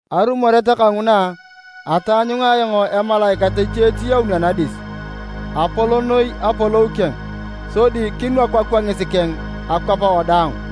Arumoret kanguna, ataanyunga ayong emalaikat eche etiyaun anadis. Apol noi apolou keng, sodi kinwaku akwangis keng akwap wadaang.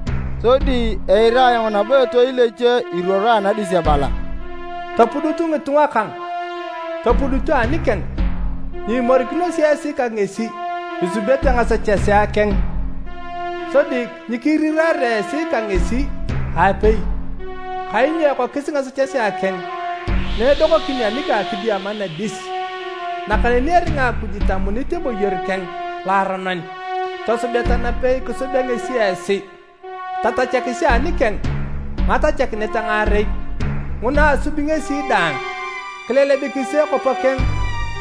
Sodi eira ayong nabo etoil eche iruoro anadis ebala, “Topudutu ngitunga kang! Topudutu anikeng! Nyiimorikinosi esi ka ngesi isubete ngasechesea keng, sodi nyikiriraare esi ka ngesi aapei! Kainyo ekokis ngasechesea keng na edokokin anang kidiama nadis, nakaneni eringa Akuj itamunit eboyor keng loaronon. Tosubeta napei kisubea ngesi esi, tatachakisi anikeng ngatachakinet ngaarei, nguna asubi ngesi daang. Kilelebikisi ekopo keng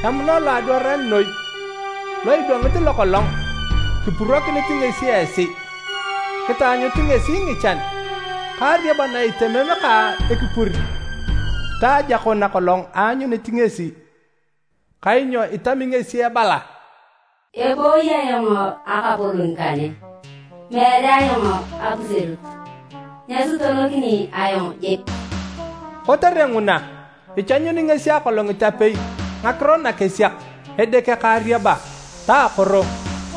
emuna loadwaran noi lo idwangit lokolong kipurokinit ngesi esi. Kitaanyutu ngesi ngichan ka ariaba na itemem ka ekipur ta ajako nakolong aanyunit ngesi. Kainyo itami ngesi ebala: ‘Ebooyi ayong akapolon kane! Meere ayong apuserut, nyasutonokini ayong jik!’ Kotere nguna, ichanyuni ngesi akolongit apei ngakiro nakesiak, edeke ka ariaba ta akoro.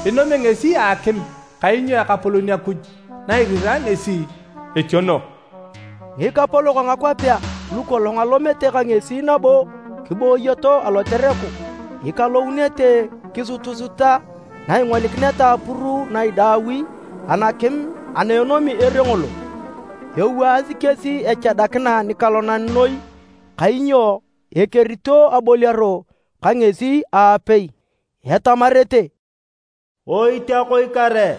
Inomio ngesi a akim, kainyo Ekapolon Akuj na irirae ngesi, etiono.” Ngikapolok a ngakwapea lukolong alomete ka ngesi nabo kiboyoto alotereku, ikalounete kisutusuta na ingolikineta apuru na idaaui anakim ana enomi ere ngolo. Ewaasi kesi echadakina nikalonan noi kainyo ekerito aboliaro ka ngesi aapei. Etamarete, “Oitiakoi kare!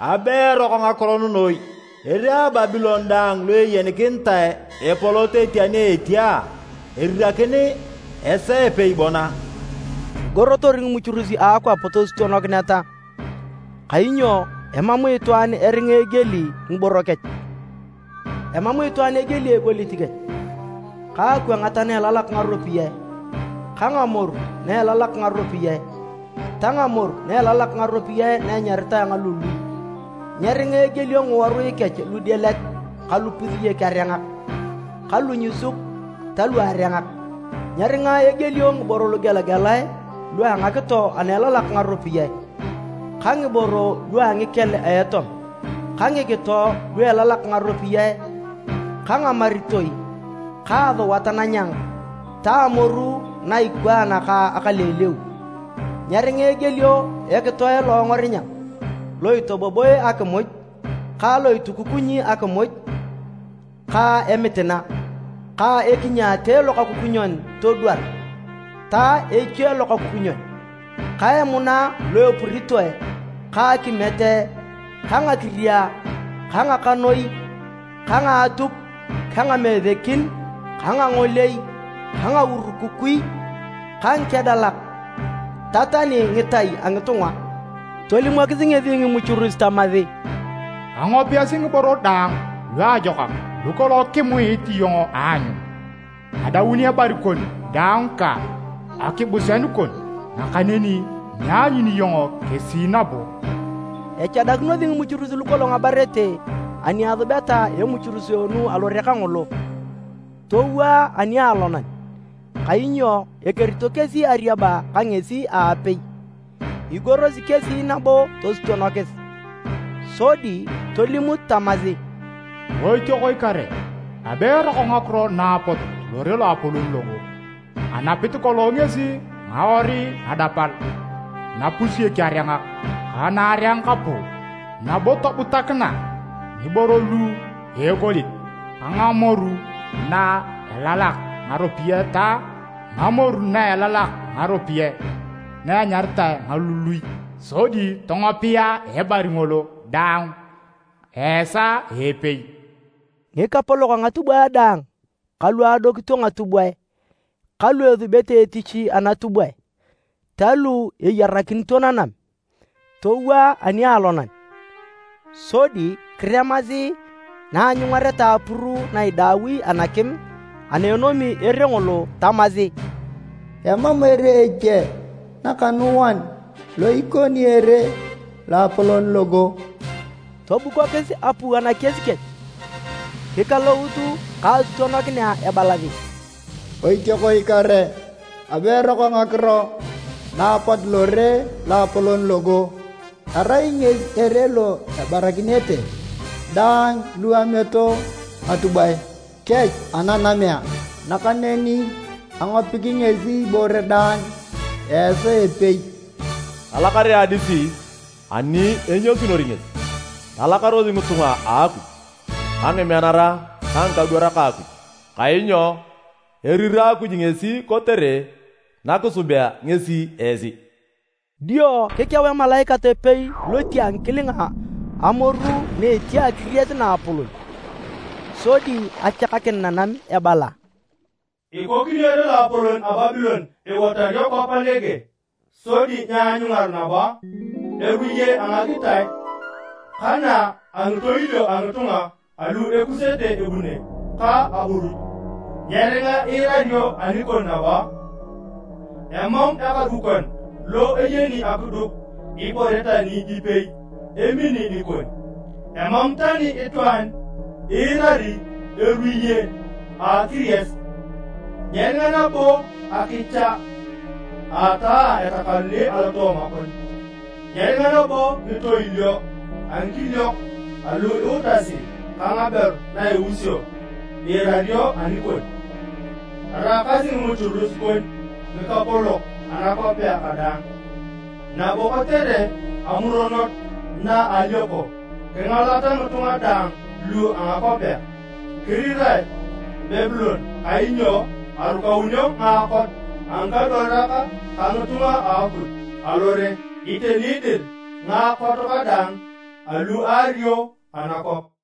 Abe eroko ngakiro nugu noi! Ere a Babilon daang lo eyenikinitae epolot etia ni etia, erirakin a esaa a epei bon a?” Igorotor ngimuchurus a akwap tosutonokineta, kainyo emam itwaan eringa egieli ngiboro kech, emam itwaan egieli egolit kech ka akwangat na elalak ngaropiyae ka ngamoru na elalak ngaropiyae ta ngamoru elalak ngaropiyae na enyaritae ngalului, nyeringa egielio ngiworui kech ludielet ka lupusiek-arengak ka lunyusuk ta luarengak. Nyeringa egielio ngiboro lugelagelae lua ngakito ana elalak ngaropiyae ka ngiboro lua ngikel a etom, ka ngikito lu elalak ngaropiyae ka ngamaritoi ka asuat nanyang ta ngamoru na ikwaan ka akaleuleu. Nyeringa egielio ekitoe loongor-nyang lo itoboboe akimuj ka lo itukukunyi akimuj ka emitina, ka ekinyaate lokakukunyon todwar ta eche lokakukunyon, ka emuna lu epuritoe ka akimiet ka ngakiria ka ngakanoi ka ngaatuk ka ngamesekin ka ngangolei ka ngaurukukui, ka ngikedalak ta tani ngitai a ngitunga. Tolimokis ngesi ngimuchurus tamasi, “Angopiasi ngiboro daang luajokak lukolong kimuit iyong aanyun, adaun ebari kon daang ka akibuseanu kon, nakaneni nyianyuni iyong kesi nabo!” Echadakinosi ngimuchurus lukolong abarete ani asubeta emuchuruseenu alore kangolo, towaa anialonan, kainyo ekerito kesi ariaba ka ngesi aapei. Igorosi kesi nabo tosutonokis, sodi tolimut tamasi, “Oitiakoi kare! Abe eroko ngakiro na apot lore lo a apolon logo! Anapit kolong ngesi ngawarui nadapal, napusiek-arengak ka naarengak puu, nabo tobutakina ngiboro lua egolit ka ngamoru na elalak ngaropiyae ta ngamoru na elalak ngaropiyae na enyaritae ngalului! Sodi tongopia ebari ngolo daang a esaa a epei!” Ngikapolok a ngatubwae daang ka lu adokito ngatubwae ka lu esubete etich anatubwae, ta lu eyarakinito nanam, towaa anialonan, sodi kiremasi na aanyungareta apuru na idaui anakim ana enomi ere ngolo tamasi, “Emam ere eche nakanuan lo ikoni ere loapolon logo!” Tobukokis apua nakies kech, kikalout ka asutonokina ebalasi, “Oitiakoi kare! Abe eroko ngakiro na apot lore loapolon logo! Erai ngesi ere lo abarakinete daang lu ameto ngatubwae kech ananamea! Nakaneni angopiki ngesi ibore daang a esaa a epei!” Talakar adis ani enyasunor ngesi! Talakaros ngitunga a Akuj ka ngimeanara ta ngikadwarak a Akuj! Kainyo erira Akuj ngesi kotere nakisubea ngesi esi! Dio kikeu emalaikat epei loti a ngikilinga amoru na etia akiries naapolon sodi achakakin nanam ebala, “Ikokinio ere loapolon a Babilon ewatario kwap nege, sodi nyeanyungar nabo! Eruye a ngagitae ka na a ngitoilio a ngitunga alu ekusete ebune ka aburuch, nyeringa iirario anikon nabo! Emam ekadukon lo eyeni akiduk ibore tani ipei emini nikon. Emam tani itwaan iirari eruye a akiries! Nyeringa nabo akicha a ataa etakanuni alotooma kon, nyeringa nabo ngitoilio a ngikiliok alu iutasi ka ngaberu na iusio iirario anikon. Araakasi ngimuchurus kon ngikapolok anakwapea kadaang, nabo kotere amuronot na a alioko, kingalata ngitunga daang lua ngakwapea!” Kirirae Babilon kainyo arukaunio ngaakot a ngikadwarak ka ngitunga a Akuj, alore. Iteni dir, ngaakot kadaang alu aario anakwap.